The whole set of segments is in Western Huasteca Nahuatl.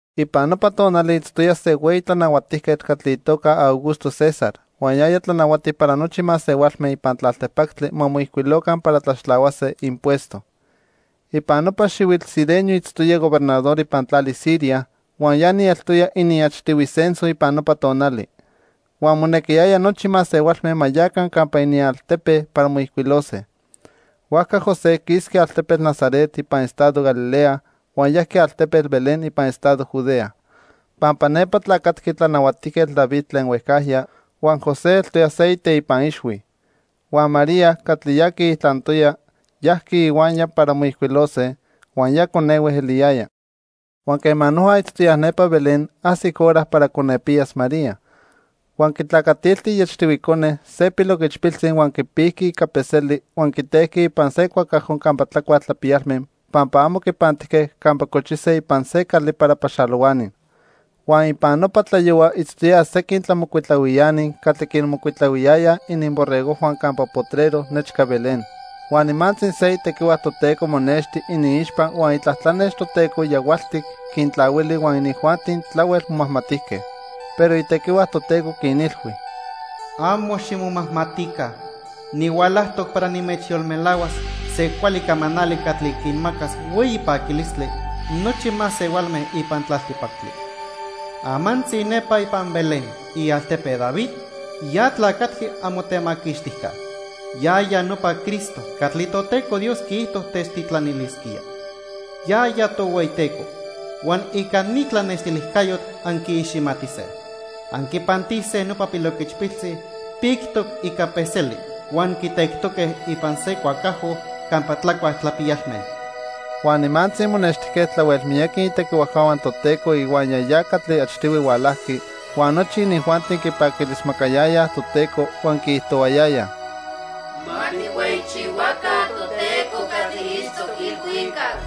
Ipan nopa tonali itztoya se hueyi tlanahuatijquetl catli itoca Augusto César huan yaya tlanahuati para nochi masehualme ipan tlaltipactli ma moijcuiloca para tlaxtlahuase impuesto. Ipan nopa xihuitl Cirenio itztoya gobernador ipan tlali Siria, huan ya ni eltoya iniachtihui censo ipan nopa tonali. Huan monequiyaya nochi masehualme ma yaca campa inialtepe para moijcuilose. Huajca José quisqui altepetl Nazaret ipan estado Galilea huan yajqui altepetl Belén ipan estado Judea; pampa nepa tlacatqui Tlanahuatijquetl David tlen huejcajya, huan José eltoya se iteipa ixhui. Huan María, catli ya quiijtlantoya, yajqui ihuaya para moijcuilose, huan ya conehue eliyaya. Huan quema noja itztoyaj nepa Belén, ajsic hora para conepiyas María. Huan quitlacatilti iachtihui cone, se piloquichpiltzi huan quipijqui ica peseli huan quitejqui ipan se cuacajo campa tlacuaj tlapiyalme pampa amo quipantijque campa cochise ipan se cali para paxalohuani. Huan ipan nopa tlayohua itztoyaj sequin tlamocuitlahuiani catli quinmocuitlahuiyayaj ininborregojhua campa potrero nechca Belén. Huan nimantzi se itequihua Toteco monexti iniixpa huan itlatlanex Toteco yahualtic quintlahuili huan inijuanti tlahuel momajmatijque. Pero itequihua Toteco quinilhui: "Amo ximomajmatica. Nihualajtoc para nimechyolmelahuas se cuali camanali catli quinmacas hueyi paquilistli nochi masehualme ipan tlaltipactli. Amantzi nepa ipan Belén, ialtepe David, ya tlacatqui amotemaquixtijca. Yaya nopa Cristo catli Toteco Dios quiijto techtitlanilisquía. Yaya Tohueyiteco. Huan ica ni tlanextilijcayotl anquiiximatise. Anquipantise nopa piloquichpiltzi pictoc ica peseli huan quitectoque ipan se cuacajo campa tlacuaj tlapiyalme." Huan nimantzi monextijque tlahuel miyaqui itequihuajcahua Toteco ihuaya ya catli achtihui hualajqui, huan nochi inijuanti quipaquilismacayayaj Toteco huan quiijtohuayayaj: "Ma tijhueyichihuaca Toteco catli itztoc ilhuicac.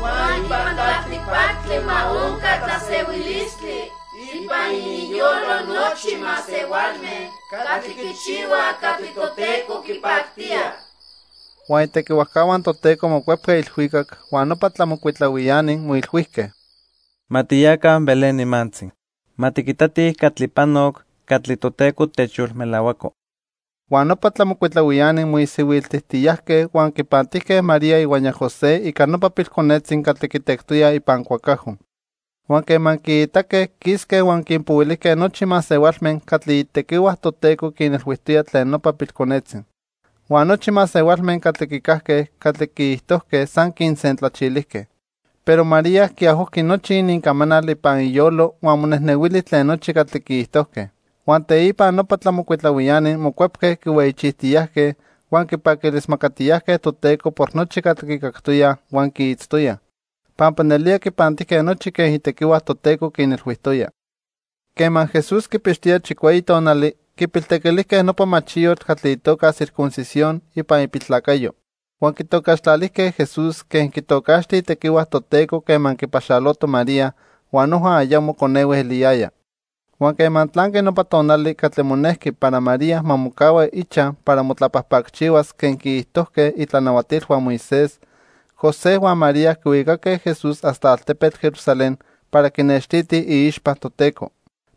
Huan ipan tlaltipactli ma onca tlasehuilistli ipan ininyolo nochi masehualme catli quichihuaj catli Toteco quipactía." Huan itequihuajcahua Toteco mocuepque ilhuicac, huan nopa tlamocuitlahuiani moilhuijque: —Ma tiyaca Belén nimantzi. Ma tiquitatij catli panoc catli Toteco techyolmelahuaco. Huan nopa tlamocuitlahuiani moisihuiltijtiyajque huan quipantijque María ihuaya José ica nopa pilconetzi catli quitectoyaj ipan cuacajo. Huan quema quiitaque, quisque huan quinpohuilijque nochi masehualme catli itequihua Toteco quinilhuijtoya tlen nopa pilconetzi. Huan nochi masehualme catli quicajque catli quiijtojque san quinsentlachilijque. Pero María quiajojqui nochi inincamanal ipan iyolo huan monejnehuili tlen nochi catli quiijtojque. Huan teipa nopa tlamocuitlahuiani mocuepque quihueyichijtiyajque, huan quipaquilismacatiyajque Toteco por nochi catli quicactoyaj huan quiitztoyaj, pampa nelía quipantijque nochi quen itequihua Toteco quinilhuijtoya. Quema Jesús quipixtoya chicueyi tonali, quipiltequilijque nopa machiyotl catli itoca circuncisión ipan ipiltlacayo. Huan quitocaxtlalijque Jesús quen quitocaxti itequihua Toteco quema quipaxaloto María huan noja ayamo conehue eliyaya. Huan quema tlanqui nopa tonali catli monejqui para María ma mocahua ichaj para motlapajpacchihuas quen quiijtojque itlanahuatilhua Moisés, José huan María quihuicaque Jesús hasta altepetl Jerusalén para quinextitij iixpa Toteco.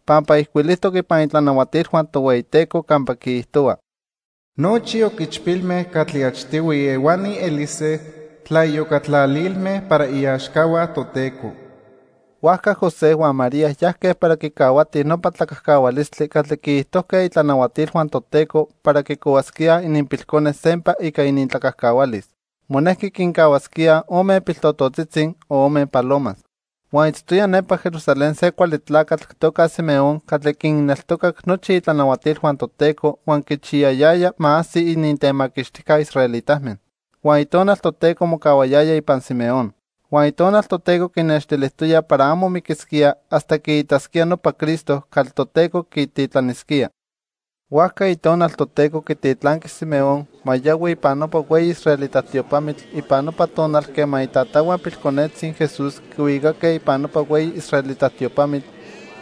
Pampa ijcuilijtoc ipan itlanahuatilhua Tohueyiteco campa quiijtohua: "Nochi oquichpilme catli achtihui ehuani elise tlaiyocatlalilme para iaxcahua Toteco." Huajca José huan María yajque para quicahuatij nopa tlacajcahualistli catli quiijtojque itlanahuatilhua Toteco para quicohuasquíaj ininpilcone sempa ica inintlacajcahualis. Monequi quincahuasquíaj ome piltototzitzi o ome palomas. Huan itztoya nepa Jerusalén se cuali tlacatl itoca Simeón catli quinneltocac nochi itlanahuatilhua Toteco huan quichiyayaya ma ajsi inintemaquixtijca israelitame. Huan Itonal Toteco mocahuayaya ipan Simeón. Huan Itonal Toteco quinextilijtoya para amo miquisquía hasta quiitasquía nopa Cristo catli Toteco quititlanisquía. Huajca Itonal Toteco quititlanqui Simeón ma yohui ipan nopa hueyi israelita tiopamitl ipan nopa tonal quema itatahua pilconetzi Jesús quihuicaque ipan nopa hueyi israelita tiopamitl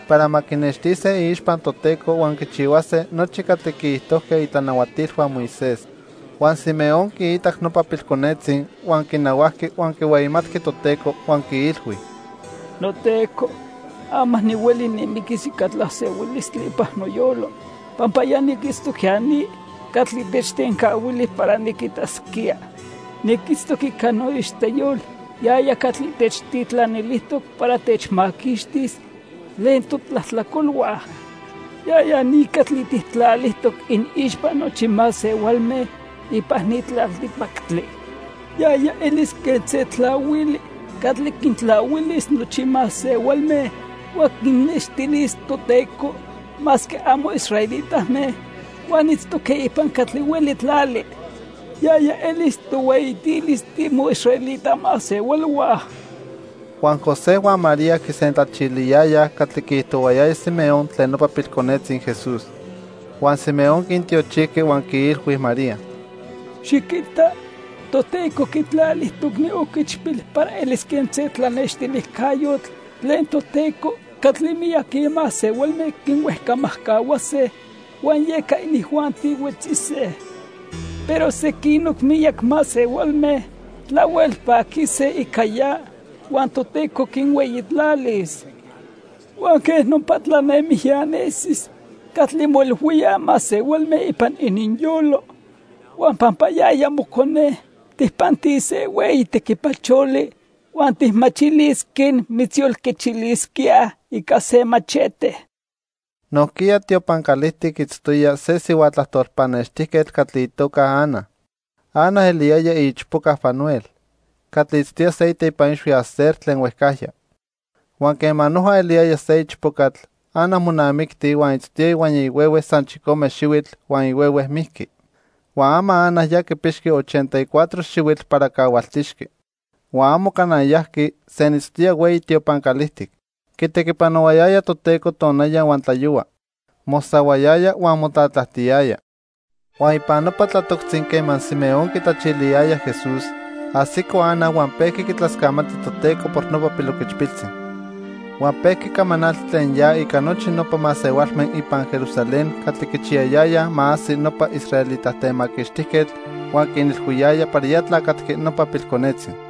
para ma quinextise iixpa Toteco huan quichihuase nochi catli quiijtojque itlanahuatilhua Moisés. Huan Simeón quiitac nopa pilconetzi, huan quinahuajqui huan quihueyimatqui Toteco huan quiilhui: "NoTeco, ama nihueli nimiquis ica tlasehuilistli ipan noyolo, pampa ya niquitztoc ya ni catli techtencahuili para niquitasquía. Niquitztoc ica noixteyol yaya catli techtitlanilijtoc para techmaquixtis tlen totlajtlacolhua. Yaya ni catli tijtlalijtoc iniixpa nochi masehualme ipan ni tlaltipactli. Yaya elis quen se tlahuili catli quintlahuilis nochi masehualme huan quinnextilis Toteco, masque amo israelitame huan itztoque ipan catli hueli tlali. Yaya elis tohueyitilis timoisraelita masehualhua." Huan José huan María quisentlachiliyayaj catli quiijtohuayaya Simeón tlen nopa pilconetzi Jesús. Huan Simeón quintiochijqui huan quiilhui María: —Xiquita, Toteco quitlalijtoc ni oquichpil para elis quen se tlanextilijcayotl tlen Toteco catli miyaqui masehualme quihuejcamajcahuase huan yeca inijuanti huetzise. Pero sequinoc miyac masehualme tlahuel paquise ica ya huan Toteco quinhueyitlalis. Huan quej nopa tlanemijya nesis catli moilhuíaj masehualme ipan ininyolo. Huan pampa yaya mocone, tijpantis se hueyi tequipacholi huan tijmachilis quen mitzyolquechilisquíaj ica se machete. Nojquiya tiopan calijtic itztoya se sihua tlajtol pannextijquetl catli itoca Ana. Ana eliyaya iichpoca Fanuel, catli itztoya se iteipa ixhui Aser tlen huejcajya. Huan quema noja eliyaya se ichpocatl, Ana monamicti, huan itztoya ihuaya ihuehue san chicome xihuitl huan ihuehue mijqui. Huan ama Ana ya quipixqui ochenta y cuatro xihuitl para cahualtixqui. Huan amo cana yajqui, senitztoya hueyi tiopan calijtic. Quitequipanohuayaya Toteco tonaya huan tlayohua, mosahuayaya huan motlatlajtiyaya. Huan ipan nopa tlatoctzi quema Simeón quitlachiliyaya Jesús, ajsico Ana huan pejqui quitlascamati Toteco por nopa piloquichpiltzi. Huan pejqui camanalti tlen ya ica nochi nopa masehualme ipan Jerusalén catli quichiyayayaj ma ajsi nopa israelita Temaquixtijquetl huan quinilhuiyaya para ya tlacatqui nopa pilconetzi.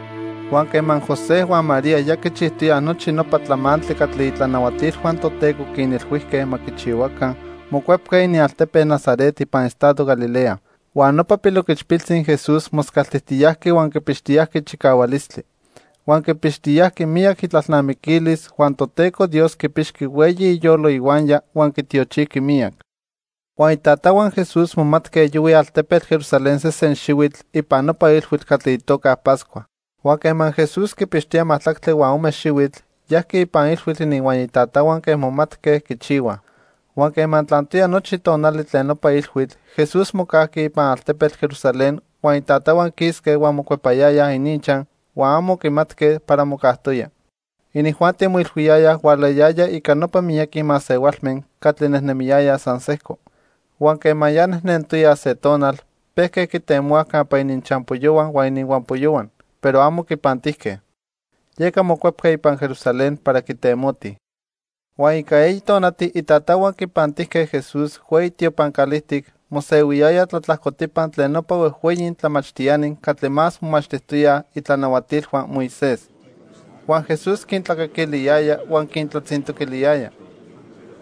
Huan quema José huan María ya quichijtoyaj nochi nopa tlamantli catli itlanahuatilhua Toteco quinilhuijque ma quichihuaca, mocuepque inialtepe Nazaret ipan estado Galilea. Huan nopa piloquichpiltzi Jesús moscaltijtiyajqui huan quipixtiyajqui chicahualistli. Huan quipixtiyajqui miyac itlalnamiquilis huan Toteco Dios quipixqui hueyi iyolo ihuaya huan quitiochijqui miyac. Huan itatahua Jesús momatque yohuij altepetl Jerusalén sesen xihuitl ipan nopa ilhuitl catli itoca Pascua. Huan quema Jesús quipixtoya majtlactli huan ome xihuitl, yajqui ipan ilhuitl ininhuaya itatahua quen momatque quichihuaj. Huan quema tlantoya nochi tonali tlen nopa ilhuitl, Jesús mocajqui ipan altepetl Jerusalén huan itatahua quisque huan mocuepayayaj ininchaj huan amo quimatque para mocajtoya. Inijuanti moilhuiyayaj hualayaya ica nopa miyaqui masehualme catli nejnemiyayaj san sejco. Huan quema ya nejnentoyaj se tonal, pejque quitemohuaj campa ininchampoyohua huan ininhuampoyohua, pero amo quipantijque. Yeca mocuepque ipan Jerusalén para quitemotij. Huan ica eyi tonati itatahua quipantijque Jesús hueyi tiopan calijtic, mosehuiyaya tlatlajcotipa tlen nopa huejhueyi tlamachtiani catli más momachtijtoyaj itlanahuatilhua Moisés. Huan Jesús quintlacaquiliyaya huan quintlatzintoquiliyaya.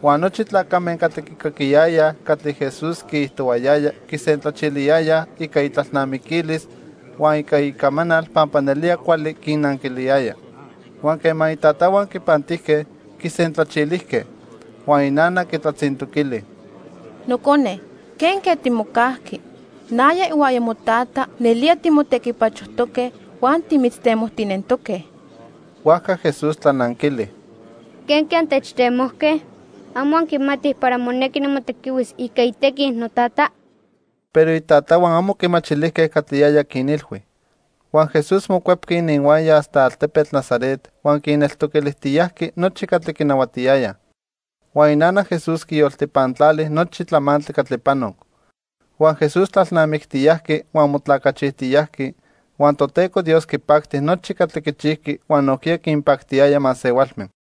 Huan nochi tlacame catli quicaquiyayaj catli Jesús quiijtohuayaya quisentlachiliyayaj ica itlalnamiquilis huan ica icamanal pampa nelía cuali quinnanquiliyaya. Huan quema itatahua quipantijque, quisentlachilijque. Huan inana quitlatzintoquili: —Nocone, ¿quenque timocajqui? Naya ihuaya motata nelía timotequipachojtoque huan timitztemojtinentoque. Huajca Jesús tlananquili: —¿Quenque antechtemojque? ¿Amo anquimatij para monequi nimotequihuis ica itequi Notata? Pero itatahua amo quimachilijque catli yaya quinilhui. Huan Jesús mocuepqui ininhuaya hasta altepetl Nazaret, huan quinneltoquilijtiyajqui nochi catli quinahuatiyayaj. Huan inana Jesús quiyoltipantlali nochi tlamantli catli panoc. Huan Jesús tlalnamictiyajqui huan motlacachijtiyajqui, huan Toteco Dios quipacti nochi catli quichijqui huan nojquiya quinpactiyaya masehualme.